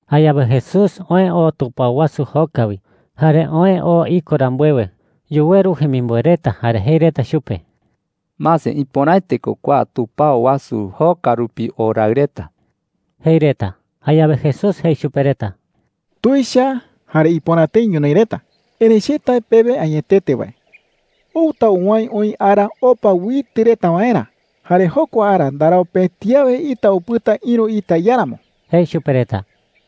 Jayawe Jesús oë oo tupao wasu joka wi. Jare oë oo iko rambuewe, yuweru jemimboe reta jare jei reta chupe: “Mase, ¡ipöraete ko kua tupao wasu joka rupi o raɨ reta!” jei reta. Jayawe Jesús jei chupe reta: “Tuicha jare ipöra tëi ñonoï reta,” jei. “Erëi che tae pewe añetete wae, outa uwäe oï ara opa uitɨ reta waerä. Jare jokua ara ndarau pëti awe ita upɨta ïru ita iáramo,” jei chupe reta.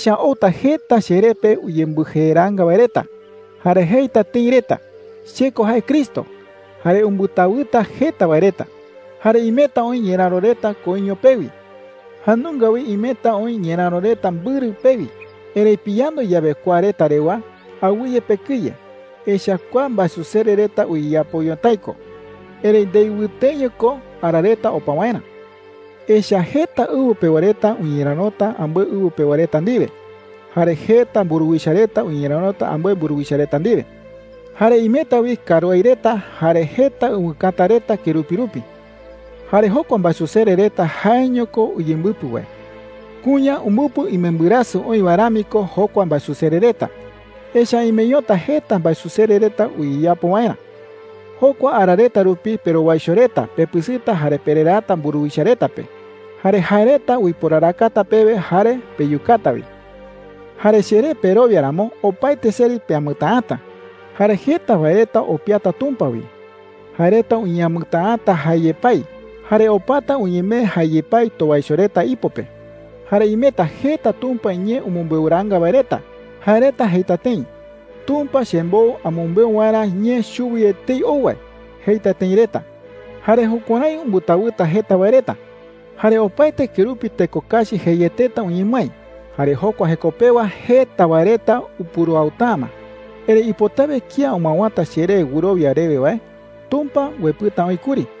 “Echa’ä outa jeta cheree pe uyembɨjeeraanga wae reta. Jare jeita tëi reta: ‘Che ko jae Cristo.’ Jare umbɨtawɨta jeta wae reta,” jei. “Jare imeta oï ñeräro reta koiño pewi. Jae nunga wi imeta oï ñeräro reta mbɨrɨ pewi. Erëi piyandu yawe kua reta rewa, awɨye pekɨye. Echa’ä kua mbaesusere reta uyeyapo ñotái ko. Erëi ndei wɨteño ko ara reta opa waerä,” jei. “Echa’ä jeta ɨwɨ pewa reta uñerärota ambɨe ɨwɨ pewa reta ndiwe, jare jeta mburuwicha reta uñerärota ambɨe mburuwicha reta ndiwe,” jei chupe reta. “Jare imeta wi karuái reta jare jeta ɨwɨkäta reta kerupi rupi. Jare jokua mbaesusere reta jaeño ko uyembɨpɨ wae. Kuña umbɨpɨ imembɨrasɨ oï wae rami ko jokua mbaesusere reta. Echa’ä imeñota jeta mbaesusere reta uyeyapo waerä,” jei chupe reta. “Jokua ara reta rupi perowaicho reta pepɨsɨta jare pereraata mburuwicha reta pe. Jare jae reta uiporarakata pewe jare peyukata wi. Jare cheré perowia ramo, opaete seri peamɨtäata,” jei. “Jare jeta wae reta opiata Tumpa wi. Jae reta uñeamɨtäata jae yepái, jare opata uñemee jae yepái towaicho reta ipo pe,” jei. “Jare imeta jeta Tumpa iñee umɨmbeuraanga wae reta. Jae reta jeita tëi: ‘Tumpa chembou amɨmbeu waerä ñee chuwi etei ou wae,’ jeita tëi reta. Jare jukuärái umbɨtawɨta jeta wae reta,” jei chupe reta. “Jare opaete kerupi teko kachi jeieteta uñemɨái. Jare jokua jeko pewa jeta wae reta upuruauta’ä ma,” jei. “Erëi ipotawe kía umɨawäta cheré wɨrowia rewe wae, Tumpa uepɨta oï kuri,” jei.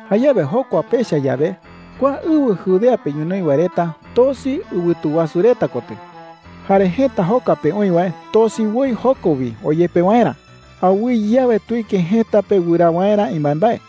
“Jayawe jokua pecha yawe, kua ɨwɨ Judea pe ñonoï wae reta tosi ɨwɨtu wasu reta kotɨ,” jei. “Jare jëta joka pe oï wae tosi woi joko wi oyepe waerä. Awɨye awe tuike jëta pe wɨraa waerä imbaembae.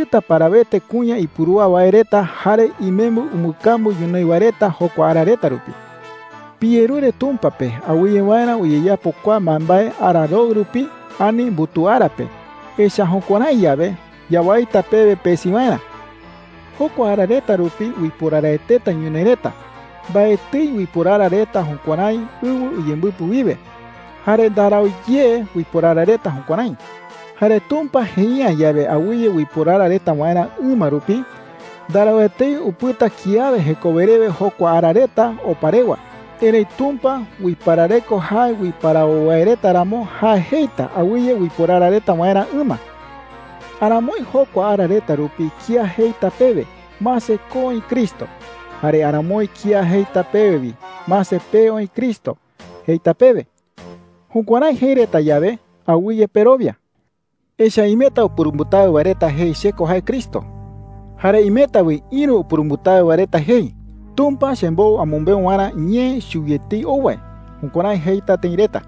“¡Ikuasɨta parawete kuña ipurúa wae reta jare imembɨ umbɨkambu ñonoï wae reta jokua ara reta rupi!” jei. “Piyerure Tumpa pe awɨye waerä uyeyapo kua mbaembae ara roɨ rupi ani mbutuu ara pe, echa’ä jukuärái yawe, yawaita pewe pesi waerä,” jei chupe reta. “Jokua ara reta rupi uiporaraeteta ñonoï reta. Mbaetɨi uiporara reta jukuärái ɨwɨ uyembɨpɨ wiwe, jare ndarau ye uiporara reta jukuärái,” jei. “Jare Tumpa jei’ä yawe awɨye uiporara reta waerä ɨma rupi, ndarau etei upɨta kiawe jekowe rewe jokua ara reta opa rewa. Erëi Tumpa uiparareko jae uiparawo wae reta ramo, jae jeita awɨye uiporara reta waerä ɨma,” jei chupe reta. “Aramoi jokua ara reta rupi kía jeita pewe, ‘Mase, ko oï Cristo.’ Jare aramoi kía jeita pewe wi, ‘Mase, pee oï Cristo,’ jeita pewe. Jukuärái jei reta yawe, awɨye perowia,” jei. “Echa’ä imeta upurumbɨtawɨ wae reta jei, ‘Che ko jae Cristo,’ jare imeta wi ïru upurumbɨtawɨ wae reta jei, ‘Tumpa chembou amɨmbeu waerä ñee chuwi etei ou wae.’ Jukuärái jeita tëi reta.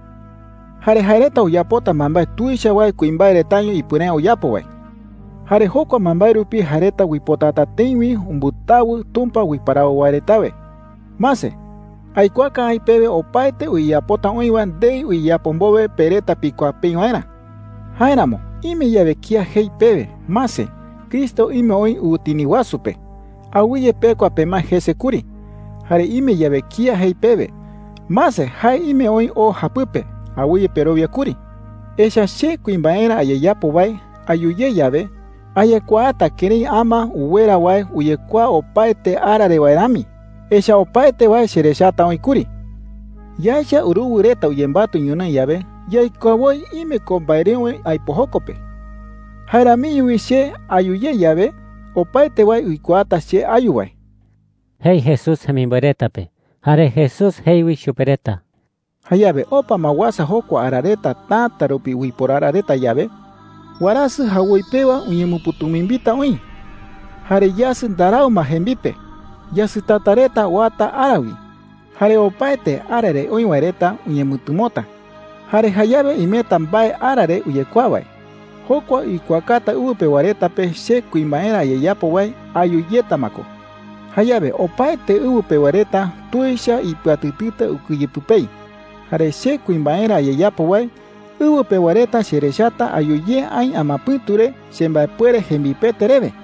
Jare jae reta uyapota mbaembae tuicha wae kuimbae retaño ipuere’ä uyapo wae. Jare jokua mbaembae rupi jae reta uipotata tëi wi umbɨtawɨ Tumpa uiparawo wae retawe,” jei. “Mase, aikuaaka aï pewe opaete uyeyapota oï wae ndei uyeyapo mbowe pe reta pikuaa peï waerä,” jei chupe reta. “Jáeramo ime yawe kía jei pewe, ‘Mase, Cristo ime oï ɨwɨtini wasu pe,’ awɨye pekua pemae jese kuri. Jare ime yawe kía jei pewe, ‘Mase, jae ime oï o japɨpe,’ awɨye perowia kuri. Echa’ä che kuimbaerä ayeyapo wae ayu ye yawe, ayekuaata kërái ama uwera wae uyekuaa opaete ara re wae rami. Echa’ä opaete wae cherechata oï kuri,” jei. “Yaecha uruwɨ reta uyembatɨ ñonoï yawe, yaikuaa woi ime ko mbaereöwe aipo joko pe. Jae ramiño wi che ayu ye yawe, opaete wae uikuaata che ayu wae,” jei Jesús jemimboe reta pe. Jare Jesús jei wi chupe reta: “Jayawe opa ma uasa jokua ara reta täta rupi uiporara reta yawe, warasɨ jawoi pewa uñemɨpɨ̈tumimbita oï, jare yasɨ ndarau ma jembipe. Yasɨtata reta oata ara wi, jare opaete ara re oï wae reta uñemɨtɨmota,” jei. “Jare jayawe imeta mbae ara re uyekuaa wae. Jokua uikuaakata ɨwɨ pewa reta pe che kuimbaerä ayeyapo wae ayu yeta ma ko. Jayawe opaete ɨwɨ pewa reta tuicha ipɨatɨtɨta ukɨye pɨpei. Jare che kuimbaerä ayeyapo wae, ɨwɨ pewa reta cherechata ayu ye aï amapɨ̈tu re chembaepuere jembipete rewe,” jei.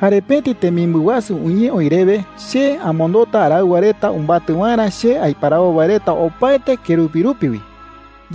“Jare pëti temimbɨ wasu uñee oï rewe che amondota araɨwa reta umbatɨ waerä che aiparawo wae reta opaete kerupi rupi wi,” jei chupe reta.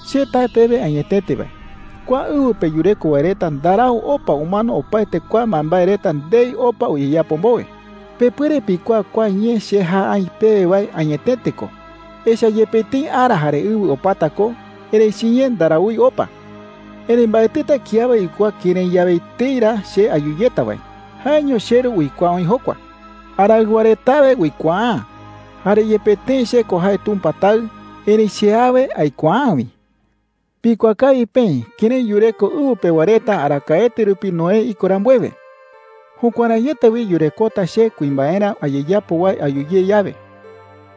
“Che tae pewe añetete wae, kua ɨwɨ pe yureko wae reta ndarau opa umano opaete kua mbaembae reta ndei opa uyeyapo mbowe,” jei. “Pepuere pikuaa kua ñee che jae aï pewe wae añetete ko. Echa’ä yepe tëi ara jare ɨwɨ opata ko, erëi chiñee ndaraúi opa,” jei chupe reta. “Erëi mbaetɨta kiawe uikuaa kërái yawe etei ra che ayu yeta wae. Jaeño cheRu uikuaa oï jokua,” jei. “Araɨwa retawe uikuaa’ä. Jare yepe tëi che ko jae Tumpa Taɨ, erëi che awe aikuaa’ä wi,” jei. “Pikuaa kawi peï kërái yureko ɨwɨ pewa reta arakaete rupi Noé iko rambuewe. Jukuäraiete wi yurekota che kuimbaerä ayeyapo wae ayu ye yawe,”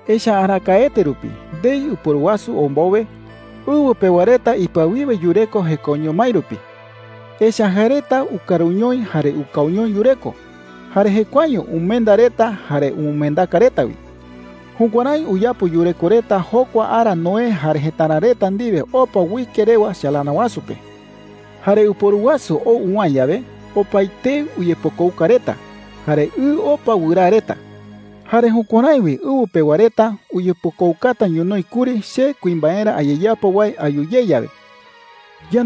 jei. “Echa’ä arakaete rupi, ndei ɨporu wasu ou mbowe, ɨwɨ pewa reta ipɨawiwe yureko jekoño mái rupi. Echa’ä jae reta ukaruñoi jare ukauñoi yureko. Jare jekuaeño umenda reta jare umɨmendaka reta wi. Jukuärái uyapo yureko reta jokua ara Noé jare jëtara reta ndiwe opa uike rewa chalana wasu pe,” jei. “Jare ɨporu wasu ou uwäe yawe, opaetei uyepokouka reta, jare ɨ opa wɨraa reta. Jare jukuärái wi ɨwɨ pewa reta uyepokoukata ñonoï kuri che kuimbaerä ayeyapo wae ayu ye yawe,” jei chupe reta.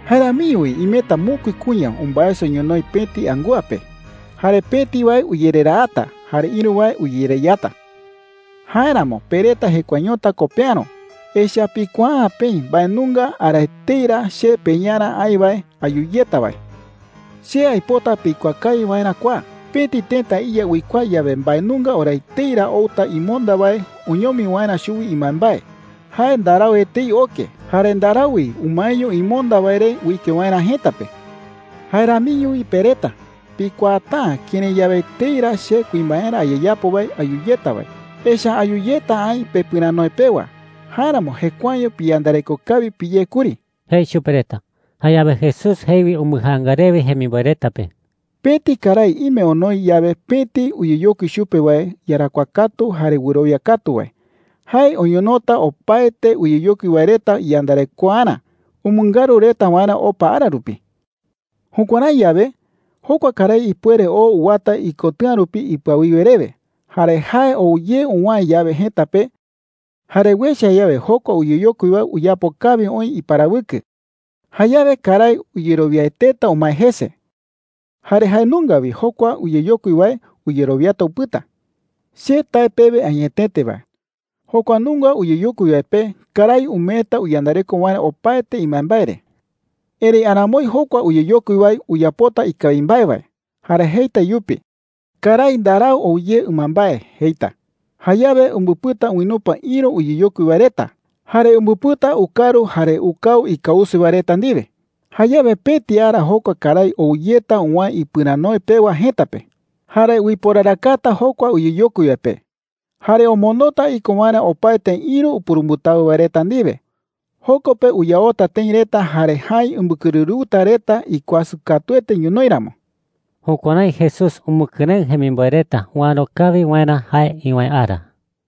“Jae ramiño wi imeta mokui kuña umbaeso ñonoï pëti angúa pe. Jare pëti wae uyereraata, jare ïru wae uyereyata,” jei chupe reta. “Jáeramo pe reta jekuaeñota ko peäro, echa’ä pikuaa’ä peï mbae nunga ara etei ra che peYarä aï wae ayu yeta wae,” jei chupe reta. “Che aipota pikuaa kawi waerä kua: pëti tëta iya uikuaa yawe mbae nunga ora etei ra outa imonda wae oñomi waerä chuwi imbaembae, jae ndarau etei oke jare ndarau wi umaeño imonda wae re uike waerä jëta pe,” jei. “Jae ramiño wi pe reta pikuaata’ä kërái yawe etei ra che kuimbaerä ayeyapo wae ayu yeta wae. Echa’ä ayu yeta aï pepɨranoe pewa. Jáeramo jekuaeño piyandareko kawi piyé kuri,” jei chupe reta. Jayawe Jesús jei wi umbɨjaanga rewe jemimboe reta pe: “Pëti karái ime onoi yawe pëti uyeyokui chupe wae iyarakuaa katu jare wɨrowia katu wae, jae oñonota opaete uyeyokui wae reta iyandarekoarä umɨngaru reta waerä opa ara rupi,” jei. “Jukuärái yawe, jokua karái ipuere oo uwata ikotɨ̈a rupi ipɨawiwe rewe. Jare jae ou ye uwäe yawe jëta pe, jare uecha yawe jokua uyeyokui wae uyapo kawi oï iparawɨkɨ, jayawe karái uyerowiaeteta umae jese. Jare jae nunga wi jokua uyeyokui wae uyerowiata upɨta,” jei. “Che tae pewe añetete wae, jokua nunga uyeyokui wae pe karái umeeta uyandareko waerä opaete imbaembae re,” jei chupe reta. “Erëi aramoi jokua uyeyokui wae uyapota ikawi mbae wae, jare jeita iyupe: ‘Karái ndarau ou ye ɨmambae,’ jeita. Jayawe umbɨpɨta uinupa ïru uyeyokui wae reta, jare umbɨpɨta ukaru jare ukau ikause wae reta ndiwe,” jei. “Jayawe pëti ara jokua karái ou yeta uwäe ipɨranoe pewa jëta pe. Jare uiporarakata jokua uyeyokui wae pe, jare omondota iko waerä opaete ïru upurumbɨtawɨ wae reta ndiwe. Joko pe uyaota tëi reta jare jäi umbɨkɨrɨrɨuta reta ikuasɨ katuete ñonoï ramo.” Jukuärái Jesús umɨkɨrëɨ jemimboe reta uäro kawi waerä jae iwäe ara.